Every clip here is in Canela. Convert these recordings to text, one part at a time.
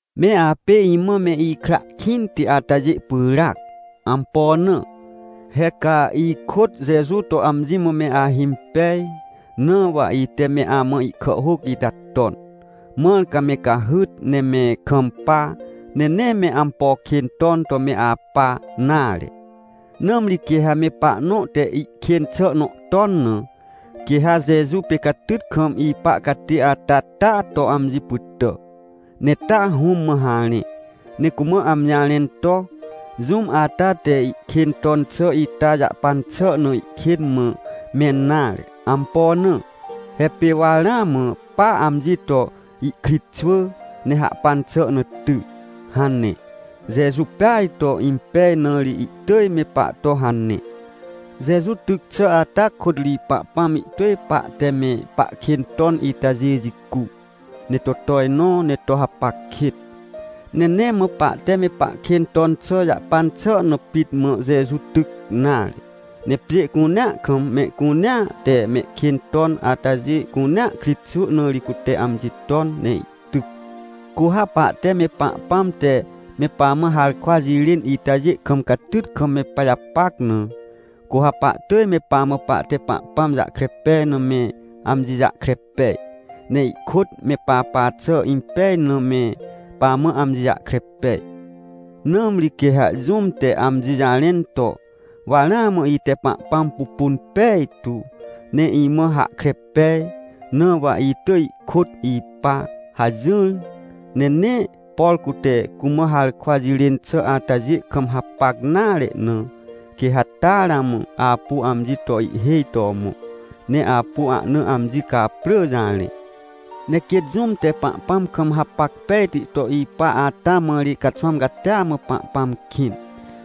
Me apê imã me ikra kĩnti atajê pyràac. Ampo na? He ca ikôt Jeju to amji mã me ahimpej, na wa ite me amã ihkàhhôc ita ton, mãr ca me cahyt ne me kampa, ne nee me ampo kên ton to me apa nare. Nãmri quê ha me pahnõ te ihkên xà nõ ton na, quê ha Jeju pê catyt kam ipa catê ata taa to amji pytà, ne taa Hũm mã harẽ. Ne cumã amji jarẽn to: — Jũm ata te ihkên ton xà ita jahpan xà na ihkên mã mẽn nare. Ampo na? He pê wa ramã pa amji to ihkritxwỳ, ne hahpan xà na ty — hane. Jeju peaj to impej, na ri ihtỳj me pahto hane. Jeju tyc xà ata kôt ri Pahpãm ihtỳj pahte me pahkên ton itajê jicu, ne to tojnõ ne to hapac kêt. Ne nee mã pahte me pahkên ton xà jahpan xà na pit mã Jeju tyc nare, ne pjê cunea kam, mehcunea te mehkên ton atajê cunea kritxwỳ na ri cute amji ton ne ihtyc. Cu ha pahte me Pahpãm te me pamã harkwa jirên itajê kam catyt kam me pajapac na, cu ha pahtỳj me pamã pahte Pahpãm jahkre pej na me amji jahkre pej, ne ihkôt me papa xà impej na, me pamã amji jahkre pej. Nãmri quê ha jũm te amji jarẽn to: — Wa ramã ite Pahpãm pupun pejtu, ne imã hahkre pej, na wa itỳj ihkôt ipa — hajỹr, ne nee por cute cumã harkwa jirên xà atajê kam hapac nare na, quê ha taa ramã apu amji to ihhêj to mõ, ne apu ahna amji caprỳ jarẽ. Ne quêt jũm te Pahpãm kam hapac pejti to ipa ata mã ri caxwãm catia mã Pahpãm kĩn,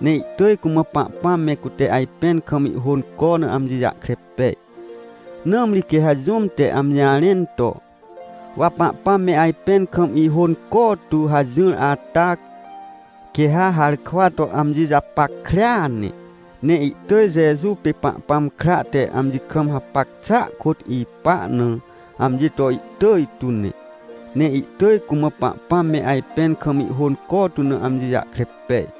ne ihtỳj cumã Pahpãm me cute ajpẽn kam ihhônco na amji jahkre pej. Nãmri quê ha jũm te amji jarẽn to: — Wa Pahpãm me ajpẽn kam ihônco tu — hajỹr ata, quê ha harkwa to amji japackrea ne, ne ihtỳj Jeju pê Pahpãm kra te amji kam hapac xàa kôt ipa na amji to ihtỳj tu ne. Ne ihtỳj cumã Pahpãm me ajpẽn kam ihhônco tu na amji jahkre pej.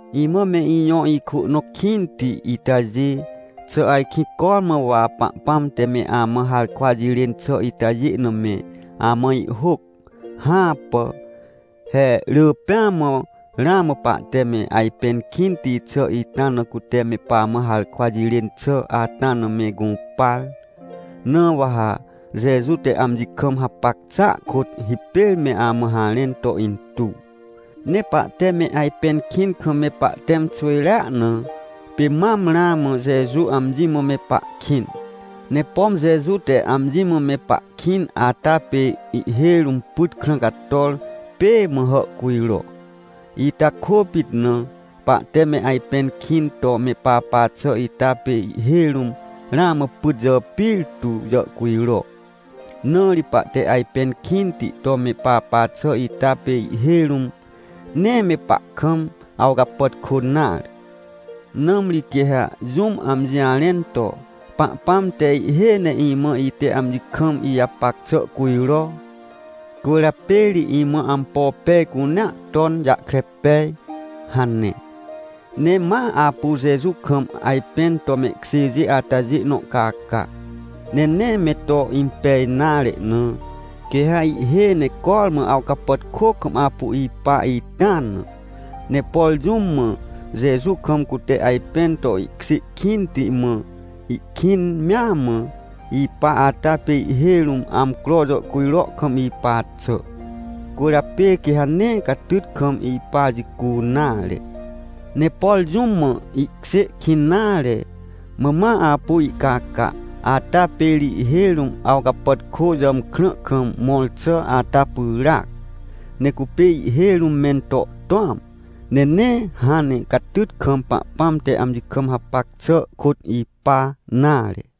Imã me ijõ ikwỳ nõ kĩnti itajê, xà ajkĩ cormã wa Pahpãm te me amã harkwa jirên xà itajê na me amã ihhôc? Hãpà! He rỳ pêa mã ramã pahte me ajpẽn kĩnti xà ita na cute me pamã harkwa jirên xà ata na me gũpar. Na wa ha Jeju te amji kam hapac xàa kôt hipêr me amã harẽn to intuw. Ne pahte me ajpẽn kĩn kam me pahtẽm xwỳjrea na, pê mam ramã Jeju amji mã me pahkĩn. Ne pom Jeju te amji mã me pahkĩn ata pê ihhêj rũm pyt krã cator pêê mã hàhcujro. Ita kôpit na, pahte me ajpẽn kĩn to me papa xà ita pê ihhêj rũm ramã pyt jàpir tu jàhcujro. Na ri pahte ajpẽn kĩnti to me papa xà ita pê ihhêj rũm, nee me pahkam awcapàtkô nare. Nãmri quê ha jũm amji jarẽn to: — Pahpãm te ihhêj ne imã ite amji kam ijapac xà cujro, cwỳrjapê ri imã ampo pej cunea ton jahkre pej — hane, ne ma apu Jeju kam ajpẽn to mehkjêjê atajê nõ caca, ne nee me to impej nare na, quê ha ihhêj ne cormã awcapàtkô kam apu ipa ita na. Ne por jũm mã Jeju kam cute ajpẽn to ihkjê kĩnti, mã ihkĩn mea mã ipa ata pê ihhêj rũm amcro jàhcujro kam ipa xà, cwỳrjapê quê ha nee catyt kam ipa jicu nare. Ne por jũm mã ihkjê kĩn nare, mã ma apu ihcaca ata pê ri ihhêj rũm awcapàtkô jàmkrã kam mõr xà ata pyràac. Ne cupê ihhêj rũm mento tũam, ne nee hãn ne catyt kam Pahpãm te amji kam hapac xà kôt ipa nare.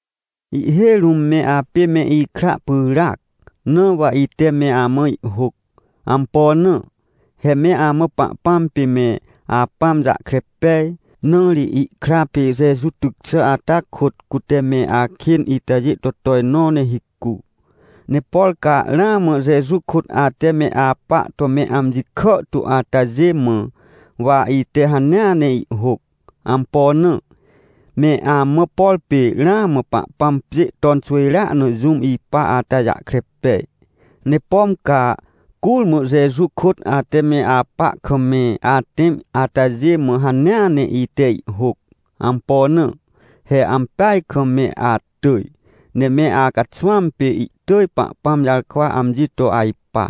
Ihhêj rũm me apê me ikra pyràac, na wa ite me amã ihhôc. Ampo na? He me amã Pahpãm pê me Apãm jahkre pej. Na ri ihkra pê Jeju tyc xà ata kôt, cute me akên itajê to tojnõ ne hicu. Ne por ca ramã Jeju kôt ate me apa to me amji kàhtu atajê mã, wa ite hanea ne ihhôc. Ampo na. Me amã, por pê ramã Pahpãm pjê ton xwỳjrea na jũm ipa ata jahkre pej. Ne pom ca curmã Jeju kôt ate me apa kam me atẽm atajê mã hanea ne ite ihhôc. Ampo na? He ampeaj kam me atỳj, ne me acaxwãm pê ihtỳj Pahpãm jarkwa amji to ajpa.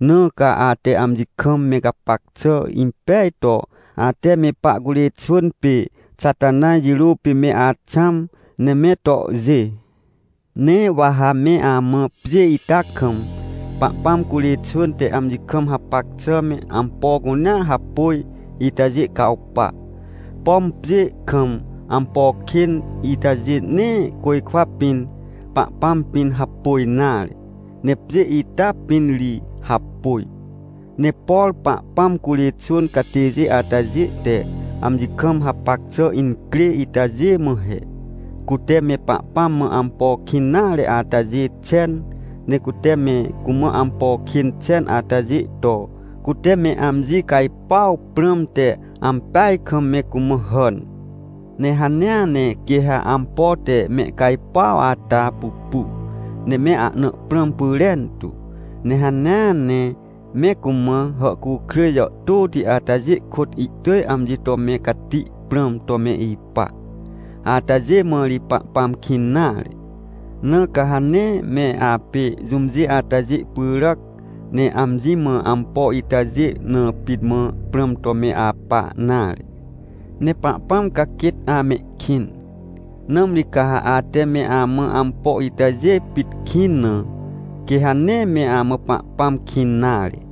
Na ca ate amji kam me gapac xà impej to, ate me pahcurê xwỳn pê Xatanaj jirô pê me axãm, ne me tohjê. Ne wa ha me amã pjê ita kam, Pahpãm curê xwỳn te amji kam hapac xà me ampo cunea hapôj itajê cawpa. Pom pjê kam ampo kên itajê nee côjkwa pĩn, Pahpãm pĩn hapôj nare, ne pjê ita pĩn ri hapôj. Ne por Pahpãm curê xwỳn catêjê atajê te amji kam hapac xà incrê itajê mã he: Cute me Pahpãm mã ampo kĩn nare atajê xen. Ne cute me cumã ampo kên xen atajê to, cute me amji cajpuaw prãmte, ampeaj kam me cumã hàn. Ne hanea ne quê ha ampo te mehcajpuaw ata pupu, ne me ahna prãm pyrentu. Ne hanea ne me cumã hàhcukrêj jàhtôti atajê kôt ihtỳj amji to me cati prãm to me ipa. Atajê mã ri Pahpãm kĩn nare. Na ca ha nee me apê jũmjê atajê pyràc, ne amji mã ampo itajê na pit mã prãm to me apa nare. Ne Pahpãm ca quêt amehkĩn. Nãmri ca ha ate me amã ampo itajê pit kĩn na, quê ha nee me amã Pahpãm kĩn nare.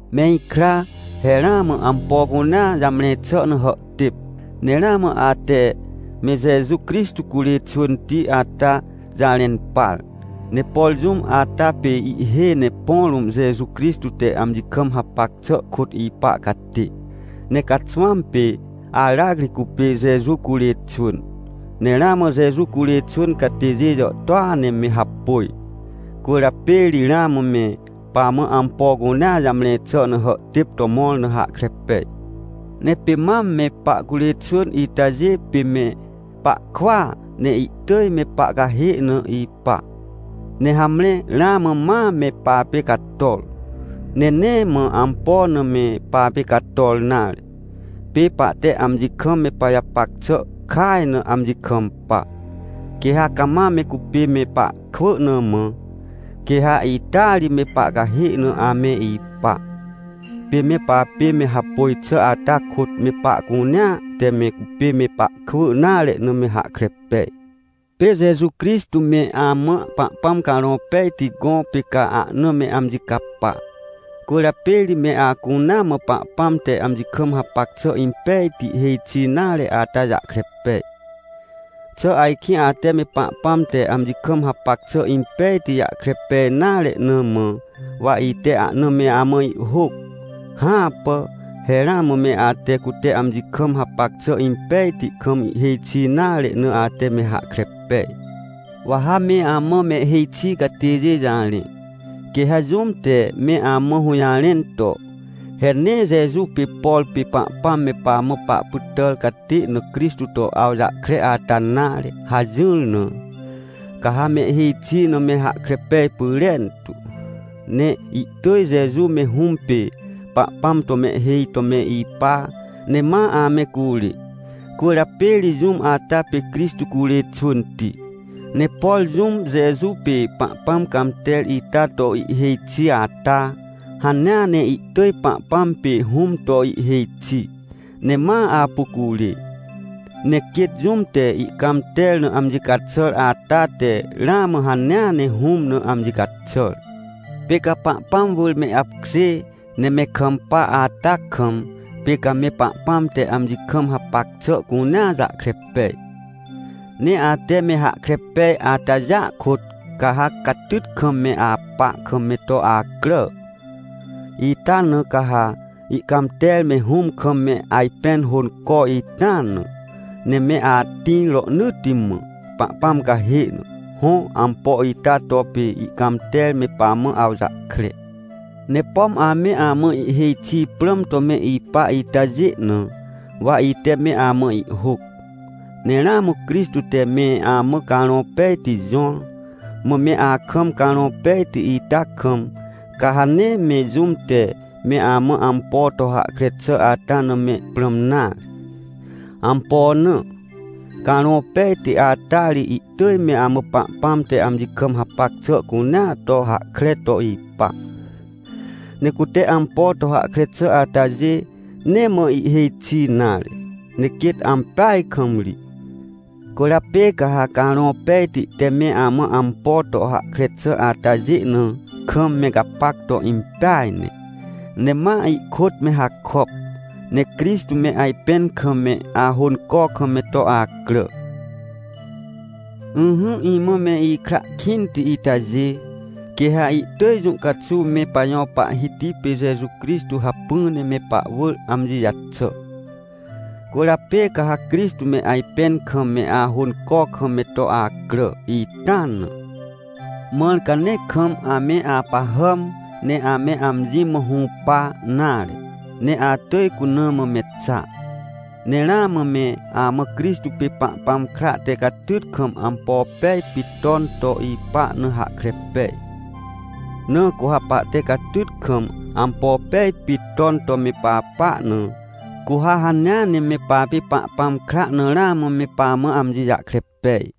Me ikra, he ramã ampo cunea jamre xà na hàhtêp. Ne ramã ate me Jeju Crixtô curê xwỳnti ata jarẽn par. Ne por jũm ata pê ihhêj ne põ rũm Jeju Crixtô te amji kam hapac xà kôt ipa catê, ne caxwãm pê aracri cupê Jeju curê xwỳn. Ne ramã Jeju curê xwỳn catêjê jàhtôa ne me hapôj, cwỳrjapê ri ramã me pamã ampo cunea jamre xà na hàhtêp to mõr na hahkre pej. Ne pê mam me pahcurê xwỳn itajê pê me pahkwỳa, ne ihtỳj me pahcahê na ipa. Ne hamre, ramã ma me papê cator, ne nee mã ampo na me papê cator nare. Pê pahte amji kam me pajapac xà kaj na amji kampa. Quê ha cama me cupê me pahkwỳ na mã, quê ha ita ri me pahcahê na ame ipa. Pê me papê me hapôj xà ata kôt me pahcunea te me cupê me pahkwỳ nare na me hahkre pej. Pê Jeju Crixtô me amã Pahpãm Carõ Pejti gõ, pê ca ahna me amji capa, cwỳrjapê ri me acunea mã Pahpãm te amji kam hapac xà impejti, hêj xi nare ata jahkre pej. Xà ajkĩ ate me Pahpãm te amji kam hapac xà impejti jahkre pej nare na mã, wa ite ahna me amã ihhôc? Hãpà. He ramã me ate, cute amji kam hapac xà impejti kam ihhêj xi nare na, ate me hahkre pej. Wa ha me amã mehhêj xi catêjê jarẽ. Quê ha jũm te me amã hũjarẽn to: — He nee Jeju pê, por pê Pahpãm me pamã pahpytàr catê na Crixtô to awjahkre ata nare — hajỹr na, ca ha mehhêj xi na me hahkre pej pyrentu. Ne ihtỳj Jeju me Hũm pê Pahpãm to mehhêj to me ipa, ne ma ame curê. Cwỳrjapê ri jũm ata pê Crixtô curê xwỳnti. Ne por jũm Jeju pê Pahpãm cãmter ita to ihhêj xi ata, hanea ne ihtỳj Pahpãm pê Hũm to ihhêj xi, ne ma apu curê. Ne quêt jũm te ihcãmter na amji caxàr ata te ramã hanea ne Hũm na amji caxàr. Pê ca Pahpãm wỳr me apkjê, ne me kampa ata kam, pê ca me Pahpãm te amji kam hapac xà cunea jahkre pej. Ne ate me hahkre pej atajêa kôt, ca ha catyt kam me apa kam me to acrà. Ita na ca ha ihcãmter me Hũm kam me ajpẽn hônco ita na, ne me atĩr rohnỳtti mã, Pahpãm cahê na. Hõ, ampo ita to pê ihcãmter me pamã awjahkre. Ne pom ame amã ihhêj xi prãm to me ipa itajê na, wa ite me amã ihhôc. Ne ramã Crixtô te me amã Carõ Pejti jõr. Mã me akam Carõ Pejti ita kam, ca ha nee me jũm te me amã ampo to hahkre xà ata na me prãm nare. Ampo na? Carõ Pejti ata ri ihtỳj me amã Pahpãm te amji kam hapac xà cunea to hahkre to ipa. Ne cute ampo to hahkre xà atajê nee mã ihhêj xi nare, ne quêt ampeaj kam ri. Cwỳrjapê ca ha Carõ Pejti te me amã ampo to hahkre xà atajê na kam me gapac to impeaj ne, ne ma ihkôt me hakop. Ne Crixtô me ajpẽn kam me ahônco kam me to acrà. Ỹhỹ, imã me ikra kĩnti itajê. Quê ha ihtỳj jũ caxuw me pajõ Pahhiti pê Jeju Crixtô hacpỹ ne me pahwỳr amji jaxà. Cwỳrjapê ca ha Crixtô me ajpẽn kam me ahônco kam me to acrà ita na. Mãr ca nee kam ame apahàm, ne ame amji mã hũpa nare, ne atỳj cuna mã me xa. Ne ramã me amã Crixtô pê Pahpãm kra te catyt kam ampo pej pit ton to ipa na hahkre pej. Na cu ha pahte catyt kam ampo pej pit ton to me papa na, cu ha hanea ne me papê Pahpãm kra na ramã me pamã amji jahkre pej.